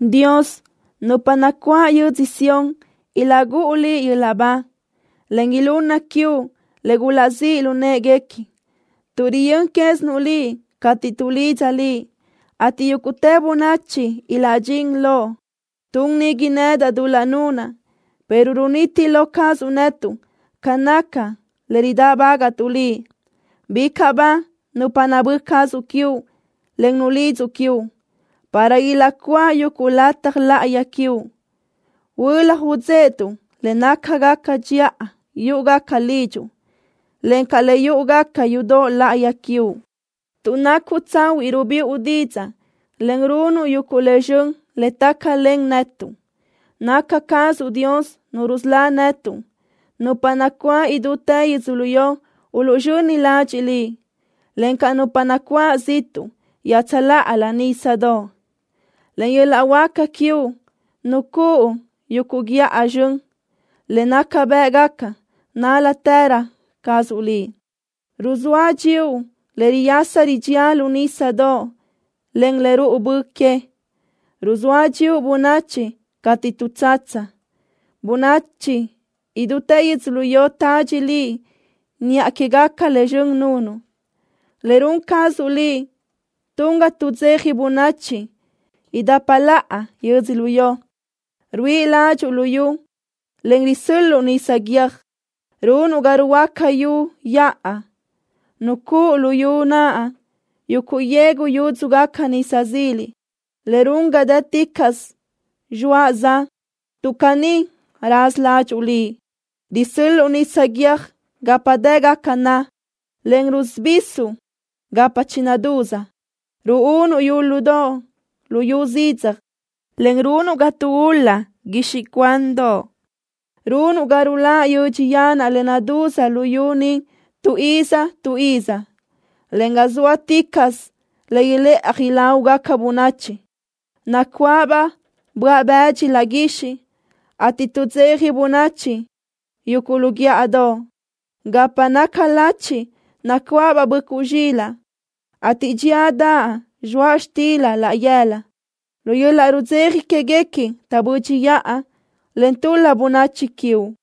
Dios, nupa nacuáʼ yödzö Sión ilaʼgúʼu Liʼ yöl-laʼ ba, en ilunna quiuʼ le gulaʼzíʼ lu në́ʼeguequi, tuʼ riyö́n quézinuʼ Liʼ cateʼ tuʼlidza Liʼ, ateʼ yúguʼtë bönachi ilaʼdxín loʼ. Tun nigui nedaʼ dul-laʼ nunaʼ, pero runiti lo cazuʼ netuʼ ca naca le ridáʼbagaʼtuʼ Liʼ. Bicaʼ ba nupa nabö́ cazuʼ quiuʼ, en nulidzuʼ quiuʼ, para ilaʼcuáʼ yuguʼ lataj láʼayi quiuʼ. Huölaj udzéʼetuʼ le nácagaca dxiʼa yúʼugaca lidxuʼ, encaʼ le yúʼugaca yudoʼ láʼayi quiuʼ. Tuʼ nacuʼ tsahuiʼ rubiʼu didzaʼ, en runuʼ yuguʼ le zxön le tácalen netuʼ. Naca cazuʼ Dios Nu rusölá netuʼ. Nupa nacuáʼ idútë yödzölió uluʼzxöni ladxiʼ Liʼ, encaʼ nupa nacuáʼ ziʼtuʼ iaʼtsöláʼalö nísadoʼ. Len yöl-laʼ huáca quiuʼ nucúʼu yuguʼ guíʼa zxön, le naca bë́ʼgaca nál-latërö cazuʼ Liʼ. Ruzóa dxíuʼ le riyasa ridxía lu nísadoʼ, en le ruʼu bö que. Ruzóa dxíuʼ bönachi cateʼ tuʼtsatsa. Bönachi idútë yödzölió tadxi Liʼ niʼa quégaca le zxön nunuʼ. Le run cazuʼ Liʼ tun ga tuʼdzeja bönachi idapa laʼa yödzölió. Ruíʼi ládxuʼu luyú, en risö́l-luʼu nisa guiö́j. Runuʼ ga ruhuöáca yu yaʼa. Nucúʼu luyú naʼ yuguʼ yegu yúdzugaca nisa zila, le run ga dë́ticaʼsö zxoaʼ-za, tuʼ caní raza ládxuʼu Liʼ. Risö́l-luʼu nisa guiö́j gapa dë́gaca na, en rusubisuʼ gapa chinadúz. Ruúnuʼ yúludoʼ luyú zidzaj, en runuʼ ga taʼgula guixiʼ cuandoʼ. Runuʼ ga ruláʼ yödx yanaʼ le nadúz luyú ni tu iz tu iz, en ga zóaticaʼsö le ilëʼaj ilágugaca bönachi. Nacuáʼabaʼ böaʼ-bëdxi laʼ guixiʼ, ateʼ tuʼdzeja bönachi yuguʼ lu guíʼadoʼ. Gapa naca lachiʼ nacuáʼabaʼ böʼcuʼ zxilaʼ, ateʼ dxíadaʼ zxoaʼ xtila laʼ yëla. Lu yöl-laʼ rudzeja quéguequi taʼbö́dxiʼa, en tul-la bönachi quiuʼ.